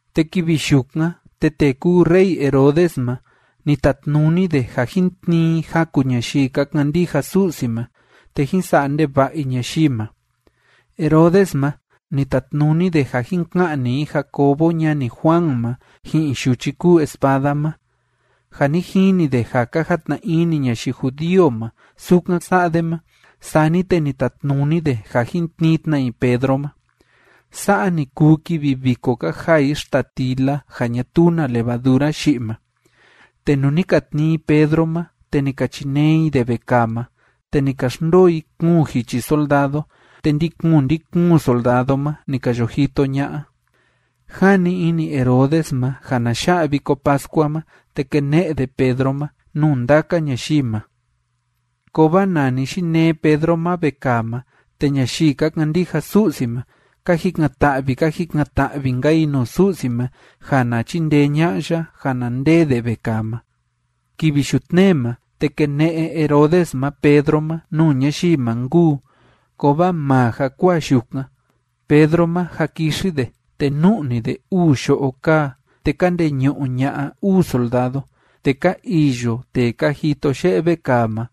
Te kivi yukan, te tee kúu rey Herodes ma, ni tatnuni de ja jín tnii i jaku ñayii ka kandija Su'si ma, te jín sa'a ndeva'a i ñayii ma. Herodes ma, ni tatnuni de ja jin ka'ni i Jacobo ñani Juan ma ji'in yuchi kúu espada ma. Ja ni jini de ja ka jatna ini ñayii judío ma sukan sa'a de ma, sani te ni tatnuni de ja jin tnii tna i Pedro ma. Sa'a ni kuu kivi viko ka jaa i xtatila ja ñatuu na levadura yi'i ma. Te nuu ni ka tnii i Pedro ma, te ni ka chinee i de vekaa ma. Te ni ka xndoo i kuun jichi soldado, te ndi‑kuun ndi‑kuun soldado ma ni ka yo jito ña'a. Jani ini Herodes ma ja na ya'a Viko Pascua ma, te kene'e de Pedro ma nuu ndaka ñayii ma. Kovaa nani yinee Pedro ma vekaa ma, te ñayii ka kandija Su'si ma, ka jikan‑ta'vi, ka jikan‑ta'vi‑nka i nuu Su'si ma ja na chindee ña'a ya ja na ndee de vekaa ma. Kivi yutnee ma, te kene'e Herodes ma Pedro ma nuu ñayii ma nkuu. Kovaa maa jakuaa yukan, Pedro ma jâ kixi de, te nu'ni de uu yo'o kaa, te ka ndeñu'u ña'a uu soldado. Te ka iyo tee ka jito ye'e vekaa ma.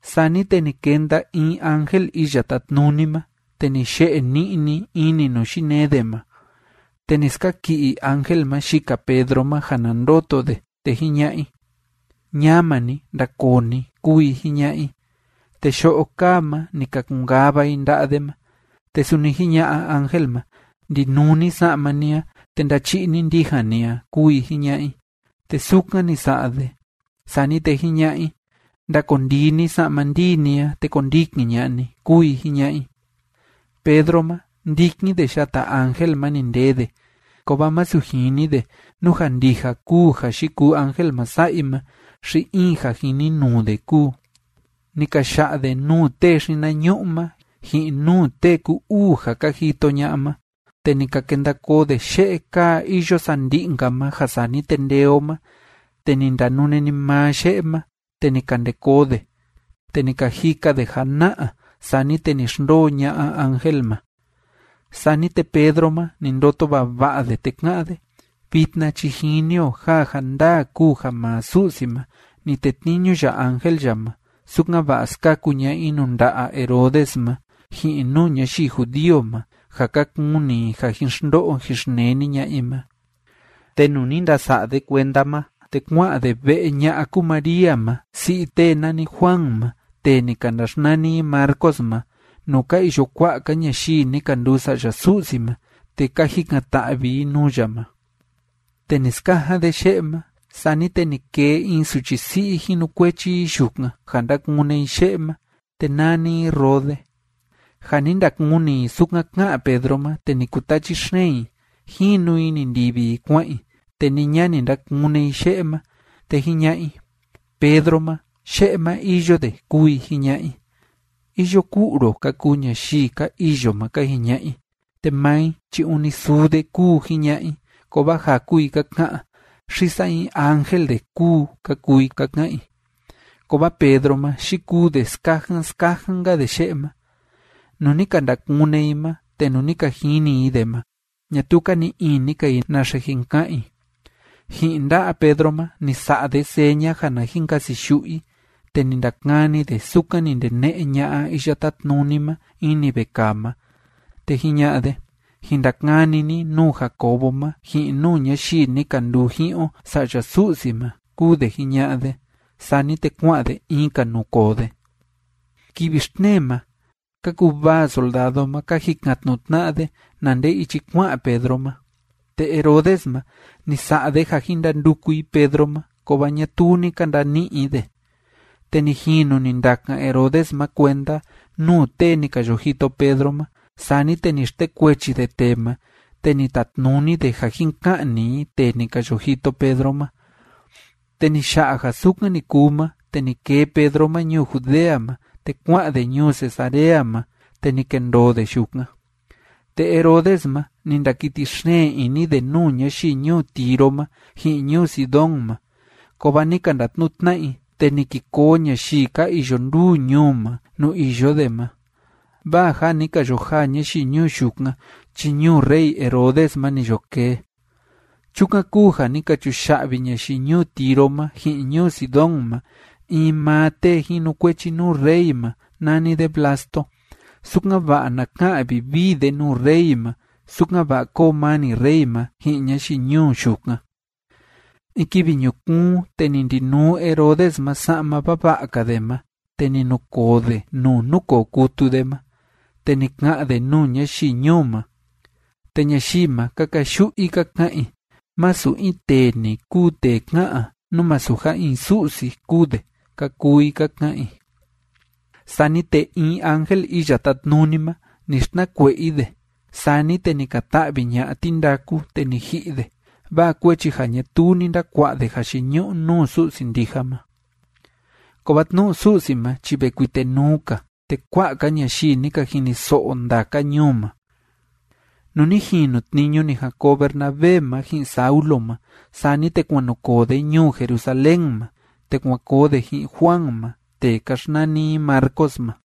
Sani te ni kenda in ángel Iya Tátnuni ma, te ni ye'e ni'ni ini nuu yinee de ma. Te ni skaki'i ángel ma yika Pedro ma ja na ndoto de, te jiña'a i: ―¡Ñama ni, ndakoo ni! ―kúu i jiña'a i. Te yo'o kaa ma, ni ka kun‑kava i nda'a de ma. Te suni jiña'a ángel ma: ―Ndinuu ni sa'ma ni a, te ndachi'i ni ndijan ni a ―kúu i jiña'a i. Te sukan ni sa'a de. Sani te jiña'a i: ―Ndakondii ni sa'ma ndii ni a, te kondikin ña'a ni ―kúu i jiña'a i. Pedro ma, ndikin de yata ángel ma ni ndee de, kovaa masu jini de nú ja ndija kúu ja yikuu ángel ma sa'a i ma xi in ja jininuu de kúu. Ni ka ya'a de nuu tee xinañu'u ma ji'in nuu tee ku‑uu ja ka jito ña'a ma, te ni ka kenda koo de ye'e kaa iyo sandi'i‑nka ma ja sani te ndee o ma. Te ni ndanune‑ni maa ye'e ma, te ni ka nde koo de. Te ni ka jika de jana'a. Sani te ni xndoo ña'a ángel ma. Sani te Pedro ma, ni ndoto vava'a de, te ka'án de: “Vitna chi jini o ja ja ndaa kúu ja maa Su'si ma, ni tetniñu ya ángel ya ma, sukan‑va'a skaku ña'a i nuu nda'a Herodes ma, ji'in nuu ñayii judío ma ja ka kuni i ja jin xndo'o jin xneni ña'a i ma.” Te nuu ni ndasa'a de kuenda ma, te kua'an de ve'e ña'a kúu María ma si'i tee nani Juan ma, tee ni ka ndaxnani i Marcos ma, nuu ka iyo kua'a‑ka ñayii ni ka nduu sa'ya Su'si ma te ka jikan‑ta'vi i nuu ya ma. Te ni skajan de ye'e ma, sani te ni kee in suchi si'i jinukuechi i yukan, ja ndakune i ye'e ma, te nani i Rode. Ja ni ndakuni i sukan ká'an Pedro ma, te ni kutachi xeen i. Jinu i ni ndivi i kua'an i, te ni ña ni ndakune i ye'e ma. Te jiña'a i: ―Pedro ma, ye'e ma iyo de ―kúu i jiña'a i. ―Iyo ku'u ro ―ka kuu ñayii ka iyo ma ka jiña'a i. Te maa i chi ûni suu de kúu, jiña'a i, kovaa jaku i ka ka'an: ―Xi saa in ángel de kúu ―ka kuu i ka ka'an i. Kovaa Pedro ma, yikuu de skajan skajan‑nka de ye'e ma. Nuu ni ka ndakune i ma te nuu ni ka jini i de ma, ñatuu ka ni'i ini‑ka i naxe jin ka'an i. Ji'in nda'a Pedro ma ni sa'a de seña ja na jin kasiyu'u i, te ni ndakani de sukan ni ndene'e ña'a Iya Tátnuni ma ini vekaa ma, te jiña'a de: ―Jin ndakani ni nuu Jacobo ma ji'in nuu ñayii ni ka nduu ji'in o sa'ya Su'si ma ―kúu de jiña'a de. Sani te kua'an de in‑ka nuu koo de. Kivi xtnee ma ka kuvaa soldado ma, ka jikan‑tnu'u tna'a de na nde ichi kua'an Pedro ma. Te Herodes ma, ni sa'a de ja jin ndanduku i Pedro ma, kovaa ñatuu ni ka ndani'i i de. Te ni jinu ni ndakan Herodes ma kuenda nuu tee ni ka yo jito Pedro ma, sani te ni xtekuechi de tee ma te ni tatnuni de ja jin ka'ni i tee ni ka yo jito Pedro ma. Te ni ya'a ja sukan ni kuu ma, te ni kee Pedro ma ñuu Judea ma, te kua'an de ñuu Cesarea ma, te ni kendoo de yukan. Te Herodes ma, ni ndakiti xeen ini de nuu ñayii ñuu Tiro ma ji'in ñuu Sidón ma, kovaa ni ka ndatnu'u tna'a i, te ni ki koo ñayii ka iyo nduu ñuu ma nuu iyo de ma, vaa ja ni ka yo jaa ñayii ñuu yukan chi ñuu rey Herodes ma ni yo kee. Chukan kúu ja ni ka chuya'vi ñayii ñuu Tiro ma ji'in ñuu Sidón ma in maa tee jinukuechi nuu rey ma nani de Blasto, sukan‑va'a na ka'an vivii de nuu rey ma, sukan‑va'a kóo mani rey ma ji'in ñayii ñuu yukan. In kivi ñukuun, te ni ndinuu Herodes ma sa'ma vava'a‑ka de ma, te ni nukoo de nuu núkoo kutu de ma, te ni ka'an de nuu ñayii ñuu ma. Te ñayii ma, ka kayu'u i ka ka'an i: ―Masu in tee‑ni kúu tee ká'an a, nú masu ja in su'si kúu de ―ka kuu i ka ka'an i. Sani te in ángel Iya Tátnuni ma, ni xtnakue'e i de, sani te ni ka ta'vi ña'a tindaku te ni ji'i de, vaa kuechi ja ñatuu ni ndakua'a de jayiñu'u nuu Su'si ndija ma. Kovaa tnu'u Su'si ma chi ve kuitenuu‑ka, te kua'a‑ka ñayii ni ka jiniso'o ndaka ñuu ma. Nuu ni jinu tniñu ni jan koo Bernabé ma ji'in Saulo ma, sani te kuan nu koo de ñuu Jerusalén ma, te kuan koo de ji'in Juan ma, tee ka xnani i Marcos ma.